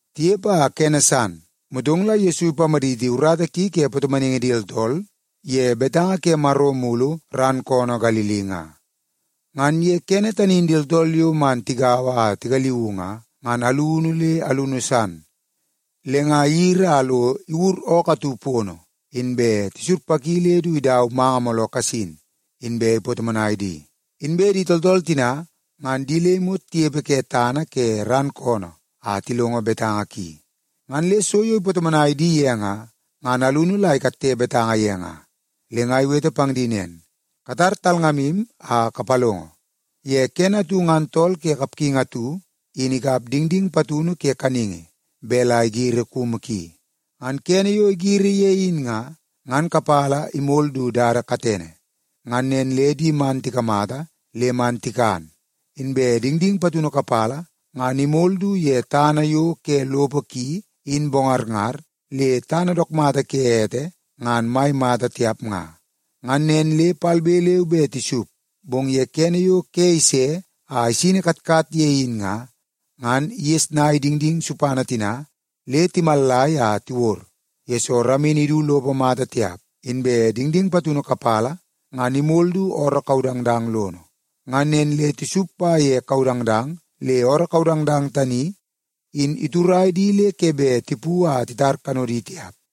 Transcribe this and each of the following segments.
Tinepe a kene san, motong la Yesu ipamaditi urata ki ke patomonaingi di tooltool ye betanga ke Maro mulu ran koonoo Galili nga. Ngan ye kene tani in di tooltool yo man tigaua a tigaliuu nga, ngan alunu le alunu san. Le nga iyiri a lo iwur ookoo atu pono, inbe tisurpaki le du idau manga mooloo kasin, inbe ipatomonai di. Inbe di tooltool tina, ngan di le imot tinepe ke tana ke ran koonoo a tilongo betanga ki. Ngan le so yo ipatomonai di ye, ngan alunu la ikatte betanga ye nga. Le nga iwete pang di nen, “Katar talngamu a kapalongo! Ye kene atu ngan tool ke kapgingi atu in ikap dingding patunu ke kaningi bet la igiri kumu ki. Ngan kene yo igiri ye in nga, ngan kapala imol du dada katene. Ngan nen le di man tikamata le man tikan. Inbe dingding patunu kapala ngan imol du ye tana yo ke lopo ki in bongarngar le tana dook mata ke ete ngan mai mata tiap nga. Ngan nen le palbe leu be tisup, bong ye kene yo ke ise a isini katkat ye in nga, ngan igesnai dingding supana tina le timallai a tiwod, yesoo ramini idu lopo mata tiap. Inbe dingding patunu kapala ngan imol du ooroo kaudangdang lono. Ngan nen le tisup pa ye kaudangdang le ooroo kaudangdang tani in iturai di le ke bet tipu a titar kanodi tiap.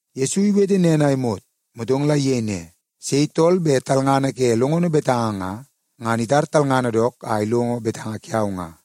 Yesu iwete nen a imot, motong la iyei ne, “Sei tool bet talngana ke longono betanga nga, ngan itar talngana dook a ilongo betanga kiau nga.”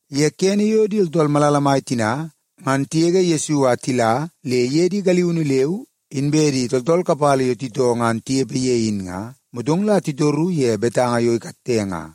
Ye kene yo di tooltool malala mai tina ngan tigege Yesu a tila le iye di galiunu leu inbe di tooltool kapala yo titoo ngan tinepe ye in nga, motong la titoru ye betanga yo ikatte nga.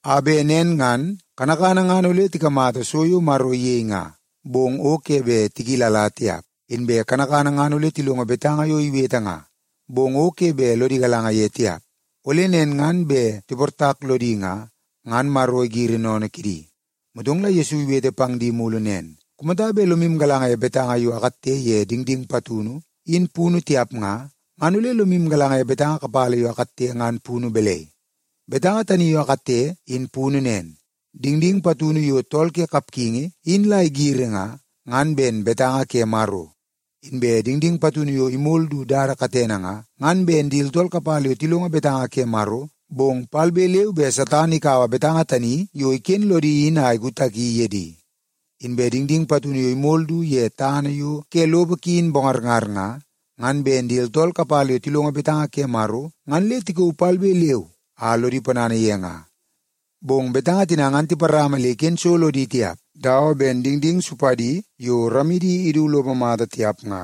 a bet nen ngan, ‘kanakana ngan ole tikamata so yo Maro iyei nga, bong o ke bet tikilala tiap. Inbe kanakana ngan ole tilongo betanga yo iwete nga, bong o ke bet lodi galanga ye tiap, ole nen ngan bet tiportak lodi nga, ngan Maro igiri sennene kidi!’” Motong la Yesu iwete pang di mulu nen, “Kumata bet lomu galanga ye betanga yo akatte ye dingding patunu in punu tiap nga, ngan ole lomu galanga ye betanga kapala yo akatte ngan punu balai? Betanga tani yo akatte in punu nen. Dingding patunu yo tool ke kapgingi in la igiri nga, ngan ben betanga ke Maro. Inbe dingding patunu yo imol du dada katene nga, ngan ben di tooltool kapala yo tilongo betanga ke Maro, bong palbe leu be Satan ikaua betanga tani yo iken lodi in a ikutaki ye di. Inbe dingding patunu yo imol du ye tana yo ke lopo ki in bongarngar nga, ngan ben di tooltool kapala yo tilongo betanga ke Maro ngan le tikauu palbe leu a lodi ponana ye nga. Bong betanga tina ngan tiparama le iken so lodi tiap dawa ben dingding supadi yo ramidi idu lopo mata tiap nga.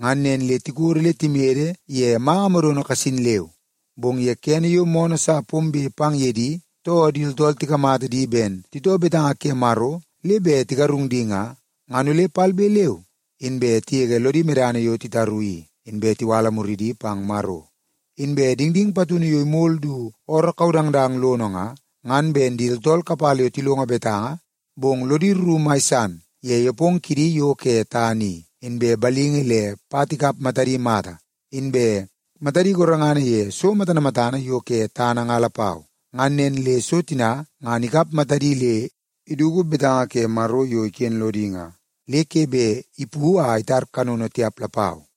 Ngan nen le tikodo le timede ye manga modono kasin leu. Bong ye kene yo moonoo sa pombe pang ye di, too di tooltool tikamata di ben titoo betanga ke Maro le bet tigarung di nga, ngan ole palbe leu inbe tigege lodi medana yo titaru i, inbe tiwala muridi pang Maro. Inbe dingding patunu yo imol du ooroo kaudangdang lono nga, ngan ben di tooltool kapala yo tilongo betanga, bong lodi rru mai san ye nepongo kidi yo ke tana i, inbe balingi le pat ikap matadi mata, inbe matadi gorengana ye so matana matana yo ke tana nga lapau. Ngan nen le so tina ngan ikap matadi le iduk betanga ke Maro yo iken lodi nga, le ke bet ipu a itar kanono tiap lapau.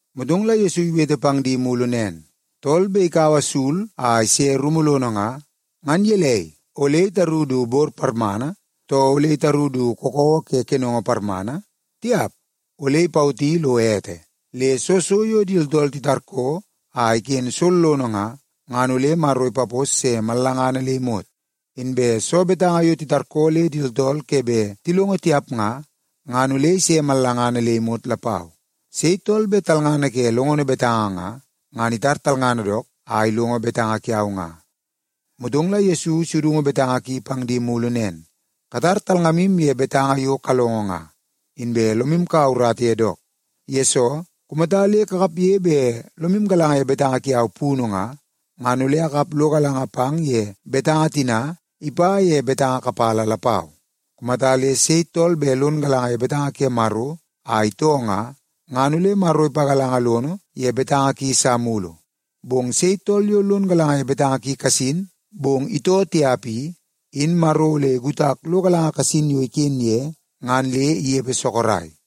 Motong la Yesu iwete pang di mulu nen, “Tool bet ikaua sul a ise rumu lono nga, ngan gelei, ole itaru du bor parmana, too ole itaru du kakawa ke kenongo parmana? Tiap! Ole ipawoti lo ete. Le soo so yo di tooltool titarkoo a iken sollono nga, ngan ole Maro ipapos se mallangana le imot. Inbe soo betanga yo titarkoo le di tooltool ke bet tilongo tiap nga, ngan ole ise mallangana le imot lapau. Sei tool bet talngana ke longono betanga nga, ngan itar talngana dook a ilongo betanga kiau nga.” Motong la Yesu isudungu betanga ki pang di mulu nen, “Katar talngamu ye betanga yo kalongo nga, inbe lomu kaua urata ye dook. Yesoo, kumata le kakapge bet lomu galanga ye betanga kiau punu nga, ngan ole akap lo galanga pang ye betanga tina ipa ye betanga kapala lapau. Kumata le sei tool bet lon galanga ye betanga ke Maro a itoo nga, ngan ole Maro ipagalanga lono ye betanga ki sa mulu. Bong sei tool yo lon galanga ye betanga ki kasin, bong itoo tiap i, in Maro ole ikutak lo galanga kasin yo iken ye ngan le inepe sorok.”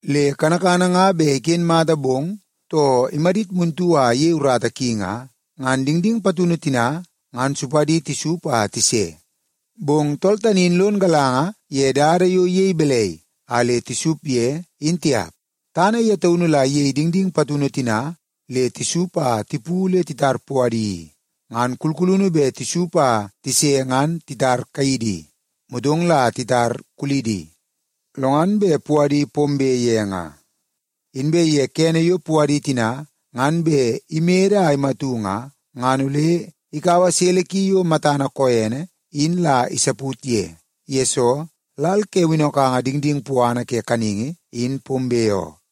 Le kanakana nga bet iken mata bong, too imadit muntu a iyei urata ki nga, ngan dingding patunu tina ngan supadi tisup a tise. Bong tool tani in lon galanga ye dada yo iyei balai a le tisup ye, in tiap. Tana ye taunu la iyei dingding patunu tina le tisup a tipu le titar puadi i. Ngan kulkulunu bet tisup a tise ngan titar kaidi, motong la titar kuludi, lo ngan bet puadi pombe ye nga. Inbe ye kene yo puadi tina ngan bet imede a imatu nga, ngan ole ikaua sele ki yo matana koene in la isaput ye. Yesoo, lal ke winnokanga dingding puana ke kaningi in pombe oo.”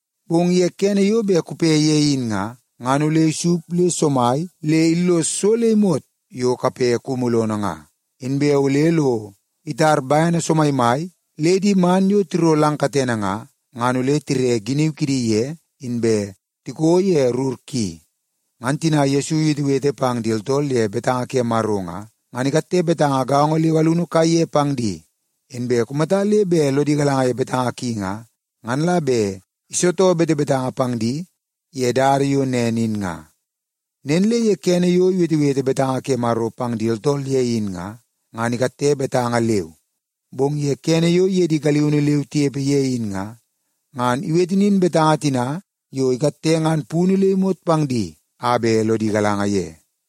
Bong ye kene yo bet kupe ye in nga, ngan ole isup le somai le illos so le imot yo kape kumu lono nga. Inbe ole lo itar bene somaimai le di man yo tiro lang katene nga, ngan ole tire giniu kidi ye inbe tiko ye rur ki.” Ngan tina Yesu iwetewete pang di tooltool ye betanga ke Maro nga, ngan ikatte betanga gaongo leu alunu kaiye pang di. Inbe kumata le bet lodi galanga ye betanga ki nga, ngan la bet isitoo betebetanga pang di ye dada yo nen in nga. Nen le ye kene yo iwetewete betanga ke Maro pang di tooltool ye in nga, ngan ikatte betanga leu. Bong ye kene yo iye di galiunu leu tinepe ye in nga, ngan iwete nin betanga tina yo ikatte ngan punu le imot pang di a bet lodi galanga ye.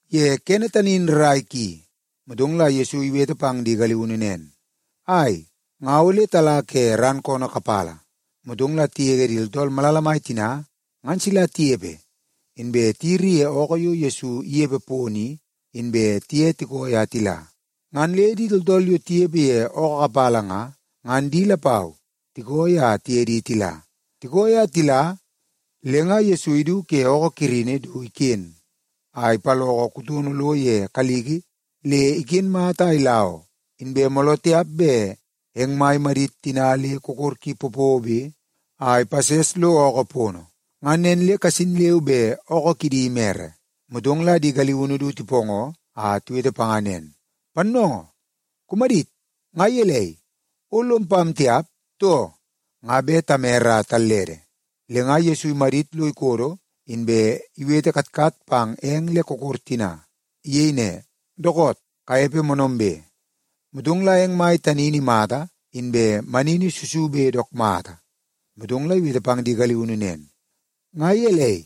Ye kene tani in rrai ki, motong la Yesu iwete pang di galiunu nen, “Ai, nga ole tala ke ran koonoo kapala.” Motong la tigege di tooltool malala mai tina ngan sila tinepe, inbe tiyiri ye ookoo yo Yesu inepe pono i, inbe tiye tikooi a tila. Ngan le di tooltool yo tinepe ye ookoo kapala nga, ngan di lapau tikooi a tiye di tila. Tikooi a tila, le nga Yesu idu ke ookoo kirini du iken a ipaloko kutono lo ye kaliki le iken mata a ila oo, inbe mooloo tiap bet eng mai imadit tina le kokor ki popobe a ipases lo ookoo pono. Ngan nen le kasin leu be ookoo kidi imere. Motong la di galiunu du tipoongoo a tiwete panga nen, “Pannoongoo, kumadit! Nga gelei, o lom pam tiap, too? Nga bet tamere a tallede!” Le nga Yesu imadit lo ikodo, inbe iwete katkat pang eng le kokor tina. Iyei ne, “Dookoot! Kanepe moonoombe!” Motong la eng mai tani in imata inbe manini susube dook mata. Motong la iwete pang di galiunu nen, “Nga gelei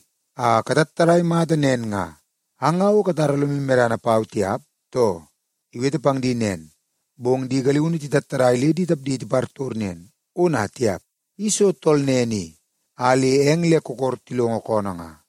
a katattadai mata nen nga? Ang nga o katara lomu medana pau tiap, too?” Iwete pang di nen, bong di galiunu titattadai le di tapdi tipartor nen, “Ona tiap! I soo tool nen i a le eng le kokor tilongo koonoo nga?”